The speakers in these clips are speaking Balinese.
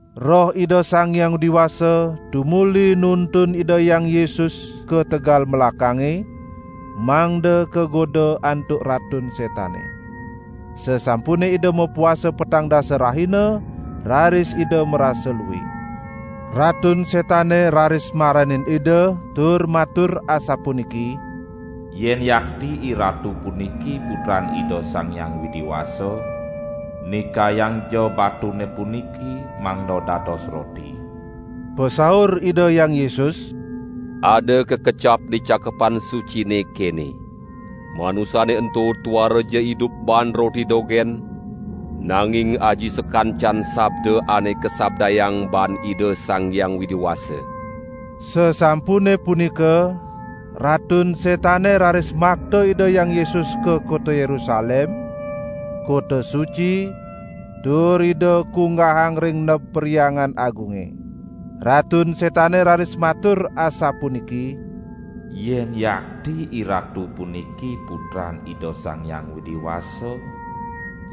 Roh Ida Sang Hyang Widi Wasa tumuli nuntun Ida Hyang Yesus ka tegal melakange mangda kagoda antuk Ratun Setane. Sasampune Ida mapuasa petang dasa rahina, raris Ida marasa lue. Ratun Setane raris maranin Ida tur matur asapuniki: "Yen yakti IRatu puniki putran Ida Sang Hyang Widi Wasa, nikayangja batune puniki mangda dados roti." Pasaur Ida Hyang Yesus: "Ada kakecap di Cakepan Sucine, kene: 'Manusane ento tuaraja idup baan roti dogen, nanging aji sakancan sabda ane kasabdayang baan Ida Sang Hyang Widi Wasa.' " Sasampune punika Ratun Setane raris makta Ida Hyang Yesus ka kota Yerusalem, kota suci, tur Ida kunggahang ring neb Perhyangan Agunge. Ratun Setane raris matur asapuniki: "Yen yakti IRatu puniki Putran Ida Sang Hyang Widi Wasa,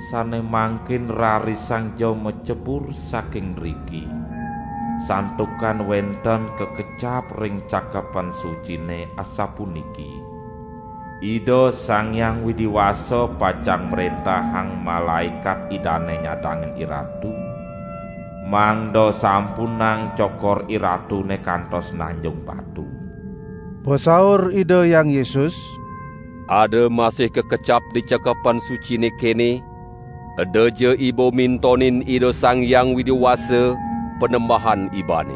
sane mangkin rarisangja macebur saking driki; santukan wenten kakecap ring Cakepan Sucine asapuniki: Ida Sang Hyang Widi Wasa pacang mrentahang malaekat Idane nyadangin IRatu, mangda sampunang cokor IRatune kantos nanjung batu.' " Pasaur Ida Hyang Yesus: "Ada masih kakecap di Cakepan Sucine kene: 'Edaja iba mintonin Ida Sang Hyang Widi Wasa Panembahan ibane.' "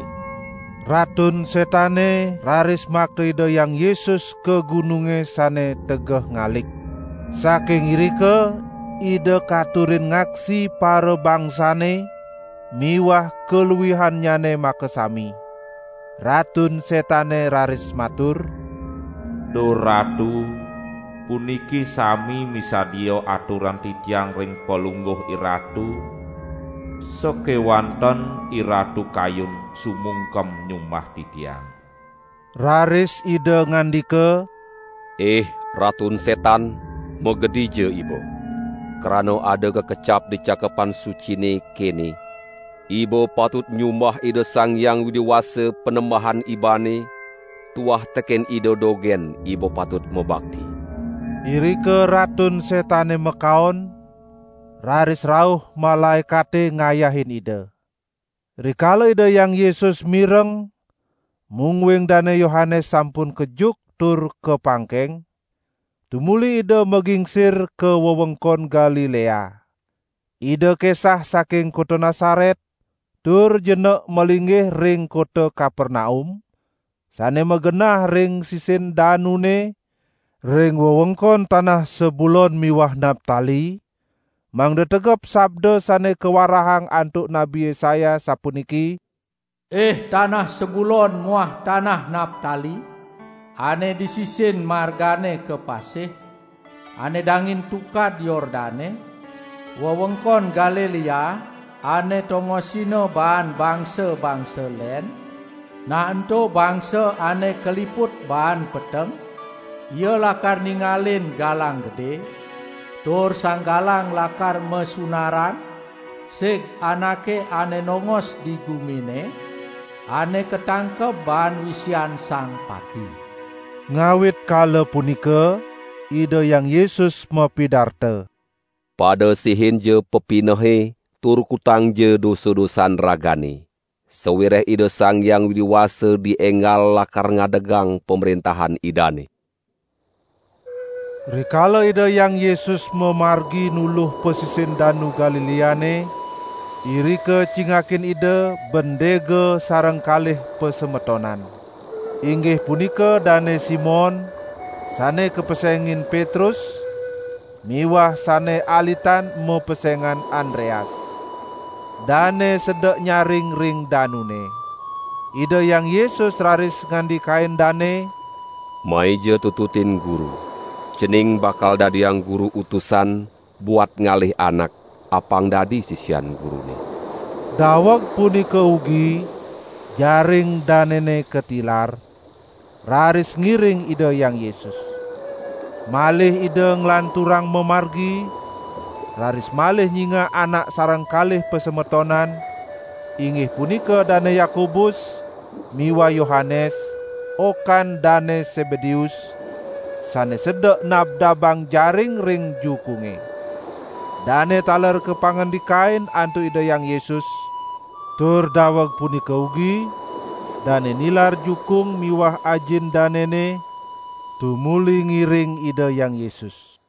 Ratun Setane raris makta Ida Hyang Yesus ka gununge sane tegeh ngalik. Saking irika Ida katurin ngaksi parabangsane miwah kaluihannyane makasami. Ratun Setane raris matur: "Duh Ratu, puniki sami misadia aturang titiang ring Palungguh IRatu, sakewanten IRatu kayun sumungkem nyumbah titiang." Raris Ida ngandika: "Ih Ratun Setan magedija iba! Krana ada kakecap di Cakepan Sucine, kene: 'Iba patut nyumbah Ida Sang Hyang Widi Wasa, Panembahan ibane, tuah teken Ida dogen iba patut mabakti!' " Irika Ratun Setane makaon, raris rauh malaekate ngayahin Ida. Rikala Ida Hyang Yesus mireng mungguing Dane Yohanes sampun kejuk tur kapangkeng, tumuli Ida magingsir ka wewengkon Galilea. Ida kesah saking kota Nasaret, tur jenek malinggih ring kota Kapernaum, sane magenah ring sisin danune, ring wewengkon tanah Sebulon miwah Naptali, mangda tegep sabda sane kawarahang antuk Nabi Yesaya sapuniki: "Ih tanah Sebulon muah tanah Naptali, ane di sisin margane ka pasih, ane dangin Tukad Yordane, wewengkon Galilea ane tongosina baan bangsa-bangsa len, nah ento bangsa ane kaliput baan peteng, ia lakar ningalin galang gede, tur sang galang lakar masunaran sig anake ane nongos di gumine ane katangkeb baan wisian sang pati." Ngawit kala punika Ida Hyang Yesus mapidarta: "Pada sehinja pepinehe tur kutangja dosa-dosan ragane, sawireh Ida Sang Hyang Widi Wasa dienggal lakar ngadegang Pamrentahan Idane!" Rikala Ida Hyang Yesus mamargi nuluh pasisin Danu Galileane, irika cingakin Ida bendega sareng kalih pasemetonan. Inggih punika Dane Simon, sane kapesengin Petrus miwah sane alitan mapesengan Andreas. Dane sedek nyaring ring danune. Ida Hyang Yesus raris ngandikain dane: "Maija tututin Guru. Cening bakal dadiang Guru utusan buat ngalih anak apang dadi sisian Gurune." Daweg punika ugi jaring danene katilar, raris ngiring Ida Hyang Yesus. Malih Ida nglanturang mamargi, raris malih nyingak anak sareng kalih pasemetonan, inggih punika Dane Yakobus miwah Yohanes, okan Dane Sebedeus, sane sedek nabdabang jaring ring jukunge. Dane taler kapangandikain antuk Ida Hyang Yesus, tur daweg punika ugi dane nilar jukung miwah ajin danene, tumuli ngiring Ida Hyang Yesus.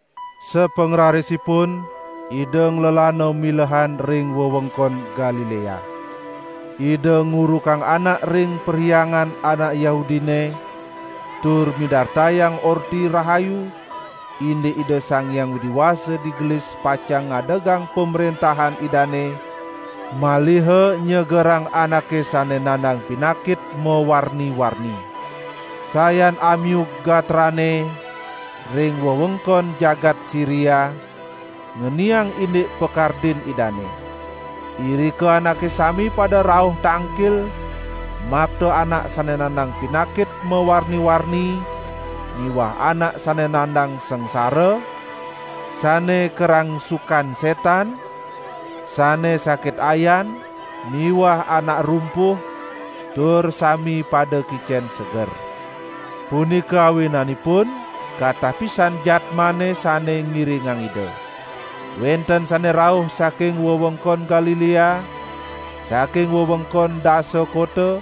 Sapangrarisipun Ida nglelana milehan ring wewengkon Galilea. Ida ngurukang anak ring perhyangan anak Yahudine tur midartayang Orti Rahayu indik Ida Sang Hyang Widi Wasa digelis pacang ngadegang Pamrentahan Idane, maliha nyegerang anake sane nandang pinakit mawarni-warni. Sayan amiug gatrane ring wewengkon jagat Siria, ngeniang indik pakardin Idane. Irika anake sami pada rauh tangkil makta anak sane nandang pinakit mawarni-warni miwah anak sane nandang sangsara, sane karangsukan setan, sane sakit ayan miwah anak rumpuh, tur sami pada kicen seger. Punika awinanipun katah pisan jadmane sane ngiringang Ida. Wenten sane rauh saking wewengkon Galilea, saking wewengkon Dasa Kota,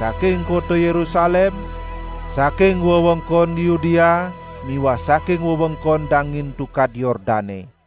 saking kota Yerusalem, saking wewengkon Yudea miwah saking wewengkon dangin Tukad Yordane.